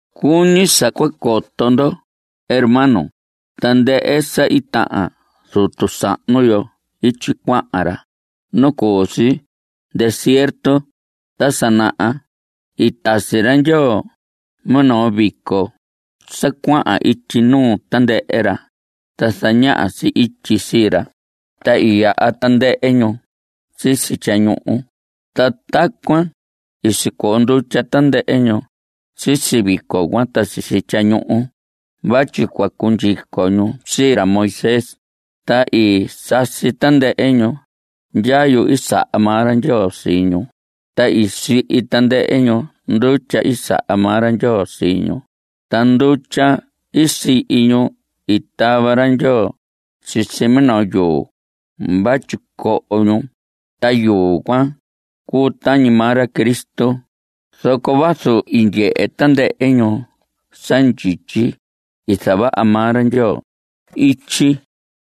Cuñi sa cua coto ndo, hermanos, tandɨhɨ sa i tahan zutu sahnu yo ityi cuahan ra nu cu si desierto ta sa naha. I tasi ra Ndyoo minoo vico sa cuahan ityi nuu tandɨhɨ ra, ta zañaha si ityi sii ra. Ta i yaha tandɨhɨ ñu sisi tyañuhu. Ta tacuan i sicoo ndutya tandɨhɨ ñu sisi vico cuan ta sisi tyañuhu vatyi cua cundyico ñu sii ra Moisés. Ta i sasi tandɨhɨ ñu ndyayu i saha maa ra Ndyoo sii ñu. Ta i sihi tandɨhɨ ñu ndutya i saha maa ra Ndyoo sii ñu. Ta ndutya i sihi ñu i tava ra Ndyoo sisi minoo yuu vatyi coho ñu. Ta yuu cuan cuu tañi maa ra Cristo. Zoco vazu i ndyehe tandɨhɨ ñu sa ndyityi i zavaha maa ra Ndyoo ityi,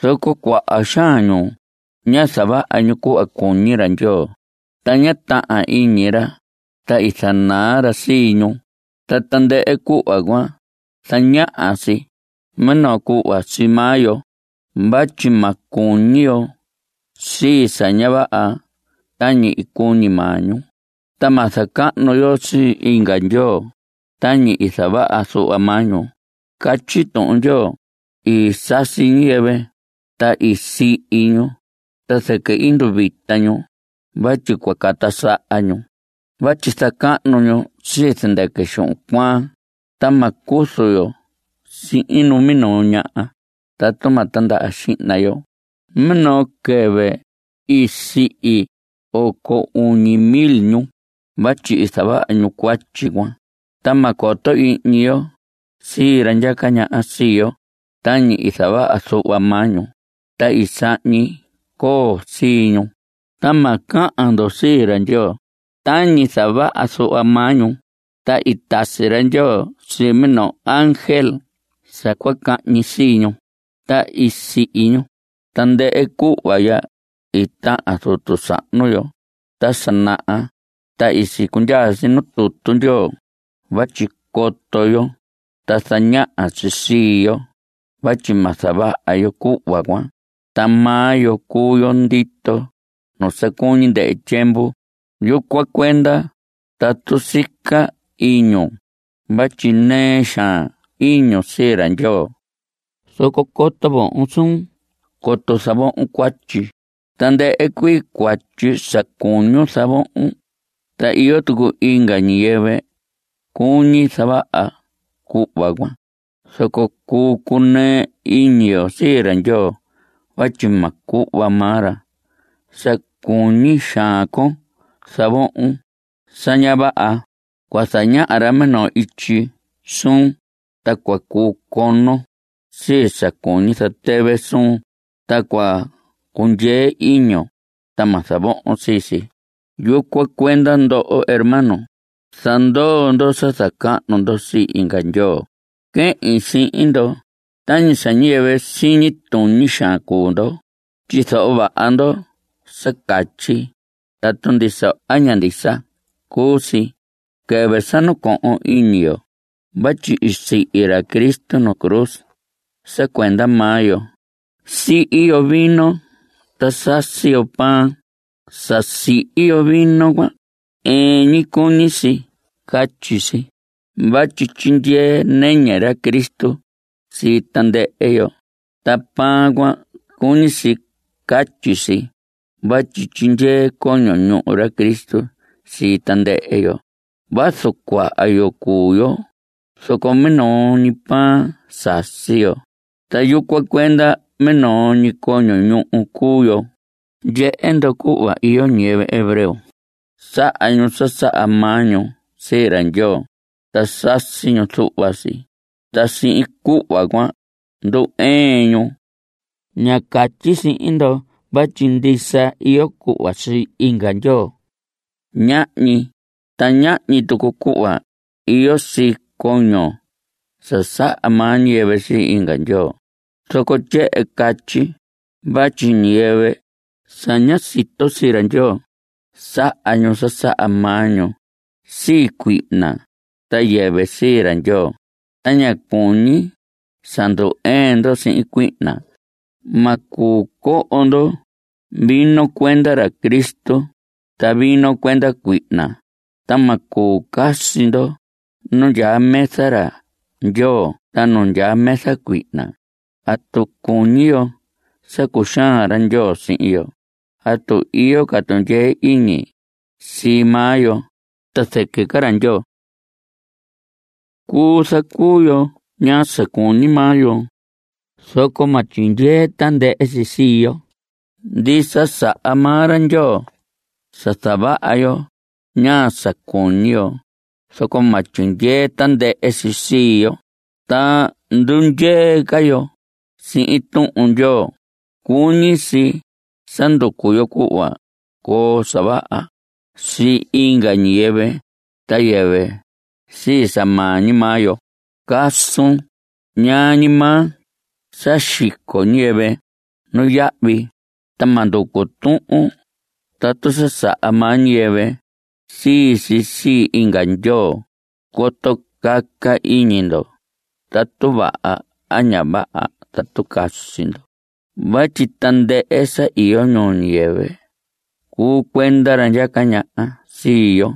zoco cuaha xaan ñu ñá zavaha ñu cuhva cuñi ra Ndyoo, ta ñá tahan iñi ra, ta i zanaa ra sii ñu. Ta tandɨhɨ cuhva cuan zañaha si minoo cuhva sii maa yo vatyi ma cuñi yo sii sa ña vaha tañi i cuñi maa ñu. Ta ma zacahnu yo sii inga ndyoo tañi i zavaha zuhva maa ñu. Catyi Tuhun Ndyoo: “I sasi ñiyɨvɨ, ta i sihi ñu, ta zɨquɨ i nduvita ñu vatyi cua cata saha ñu” (vatyi zacahnu ñu sii zɨndɨquɨ xuhun cuaan). Ta ma cuzu yo sihin numinoo ñaha tatu ma tindaha xihna yo. Minoo quɨvɨ i sihi oco uñi mil ñu vatyi i zavaha ñu cuatyi cuan. Ta ma coto ihñi yo sii ra ndyaca ñaha sii yo tañi i zavaha zuhva maa ñu, ta i sahñi coo sii ñu. Ta ma cahan ndo sii ra Ndyoo tañi i zavaha zuhva maa ñu, ta i tasi ra Ndyoo sii minoo ángel sa cua cahñi sii ñu, ta i sihi ñu. Tandɨhɨ cuhva ya i tahan zutu sahnu yo ta sa naha, ta i sicundyaa si nuu tutu Ndyoo vatyi coto yo. Ta zañaha si sii yo vatyi ma zavaha yo cuhva cuan. Ta maa yo cuu yo ndito nu sa cuñi ndɨhɨ tyiemvu. Yucuan cuenda tatu sica iñun vatyi nɨɨ xaan iñun sii ra Ndyoo, zoco coto vohon suun coto zavohon cuatyi. Tandɨhɨ cuii cuatyi sa cuñun zavohon ta iyo tucu inga ñiyɨvɨ cuñi zavaha cuhva cuan. Zoco cuu cunɨɨ iñi yo sii ra Ndyoo vatyi ma cuhva maa ra sa cuñi xaan con zavohon sa ña vaha. Cua zañaha ra minoo ityi suun, ta cua cuu conon sii sa cuñi zatɨvɨ suun. Ta cua cundyee iñun ta ma zavohon sii si. Yucuan cuenda, ndoho hermanos, zandoo ndo sa zacahnu ndo sii inga ndyoo. Quehin sihin ndo tañi sa ñiyɨvɨ siñi tuñi xaan cuu ndo. Tyizoho vaha ndo sa catyi tatu ndisa a ña ndisa cuu si. Quɨvɨ sa nacohon iñi yo vatyi i sihi ra Cristo nuu cruz sa cuenda maa yo, sihi yo vino ta sasi yo pan. Sa sihi yo vino cuan ɨɨn ñi, cuñi si catyi si vatyi tyindyee nɨñɨ ra Cristo sii tandɨhɨ yo. Ta pan cuan cuñi si catyi si vatyi tyindyee coño ñuhu ra Cristo sii tandɨhɨ yo. Vazu cuaha yo cuu yo, zoco minoo ñi pan sasi yo, ta yucuan cuenda minoo ñi coño ñuhu cuu yo. Ndyehe ndo cuhva iyo ñiyɨvɨ hebreo, saha ñu sa saha maa ñu sii ra Ndyoo, ta sasi ñu zuhva si. Ta sihin cuhva cuan ndu‑ɨɨn ñu. Ña catyi sihin ndo vatyi ndisa iyo cuhva sii inga ndyoo. Ñahñi. Ta ñahñi tucu cuhva iyo sii coño sa saha maa ñiyɨvɨ sii inga ndyoo. Zoco tyehen catyi vatyi ñiyɨvɨ sa ña sito sii ra Ndyoo, saha ñu sa saha maa ñu sii cuihna ta yɨvɨ sii ra Ndyoo. Ta ña cuñi sa ndu‑ɨɨn ndo sihin cuihna. Ma cuu coho ndo vino cuenda ra Cristo ta vino cuenda cuihna. Ta ma cuu casi ndo nu ndyaa mesa ra Ndyoo ta nu ndyaa mesa sii cuihna. ¿Atu cuñi yo sa cuxaan ra Ndyoo sihin yo? ¿Atu iyo ca tundyee iñi sii maa yo ta zɨquɨ ca ra Ndyoo? Cuu zacuu yo ñaa sa cuñi maa yo, zoco ma tyindyee tandɨhɨ si sii yo. Ndisa, saha maa ra Ndyoo sa zavaha yo ñaa sa cuñi yo, zoco ma tyindyee tandɨhɨ si sii yo ta ndundyee ca yo sihin Tuhun Ndyoo. Cuñi si sa nducu yo cuhva coo sa vaha sii inga ñiyɨvɨ ta yɨvɨ sii sa maa ñi maa yo. Casun ñaa ñi maa sa xico ñiyɨvɨ nuyahvi, ta ma nducu tuhun tatu sa saha maa ñiyɨvɨ sii si sii inga ndyoo coto caca iñi ndo tatu vaha a ña vaha tatu casi ndo. Vatyi tandɨhɨ sa iyo ñuu ñiyɨvɨ cuu cuenda ra ndyaca ñaha sii yo.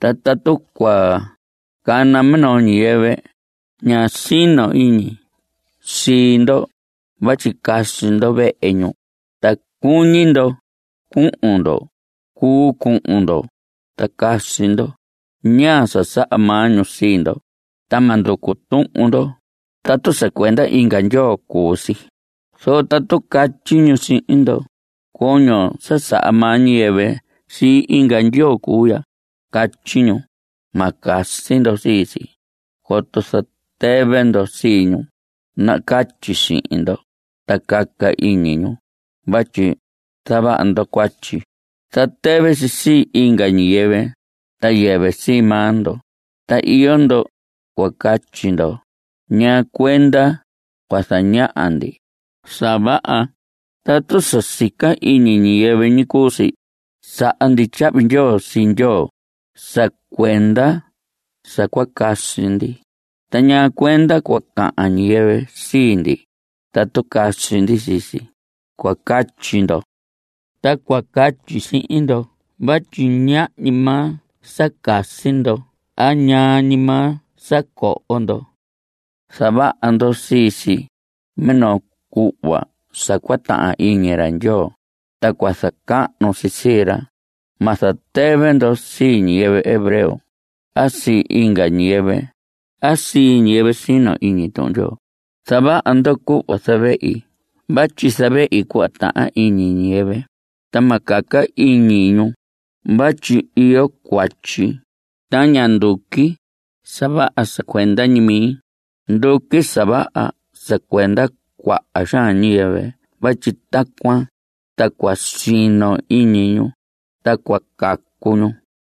Ta tatu cua cana minoo ñiyɨvɨ ña sino iñi sii ndo vatyi casi ndo vehe ñu ta cuñi ndo cuhun ndo, cuu cuhun ndo ta casi ndo ñaa sa saha maa ñu sii ndo. Ta ma nducu tuhun ndo tatu sa cuenda inga ndyoo cuu si. Zoco tatu catyi ñu sihin ndo: “Coño sa saha maa ñiyɨvɨ sii inga ndyoo cuu ya”, catyi ñu. Ma casi ndo sii si coto zatɨvɨ ndo sii ñu nacatyi sihin ndo ta caca iñi ñu vatyi zavaha ndo cuatyi. Zatɨvɨ si sii inga ñiyɨvɨ ta yɨvɨ sii maa ndo. Ta iyo ndo cua catyi ndo: “¿Ñaa cuenda cua zaña ndi sa vaha, tatu sa sica iñi ñiyɨvɨ ñi cuu si? Saha ndi tyahvi ndyoo sii Ndyoo sa cuenda sa cua casi ndi, ta ¿ñaa cuenda cua cahan ñiyɨvɨ sii ndi tatu casi ndi sii si?” cua catyi ndo. Ta cua catyi sihin ndo vatyi ñaa ñi maa sa casi ndo a ñaa ñi maa sa coho ndo, zavaha ndo sii si minoo cuhva sa cua tahan iñi ra Ndyoo ta cua zacahnu si sii ra. Ma zatɨvɨ ndo sii ñiyɨvɨ hebreo a sii inga ñiyɨvɨ a sii ñiyɨvɨ sino iñi Tuhun Ndyoo. Zavaha ndo cuhva zavehi vatyi zavehi cuhva tahan iñi ñiyɨvɨ, ta ma caca iñi ñu vatyi iyo cuatyi. Ta ña nduqui sa vaha sa cuenda ñi mi. Nduqui sa vaha sa cuenda cuaha xaan ñiyɨvɨ vatyi tacuan ta cua sino iñi ñu ta cua cacu ñu.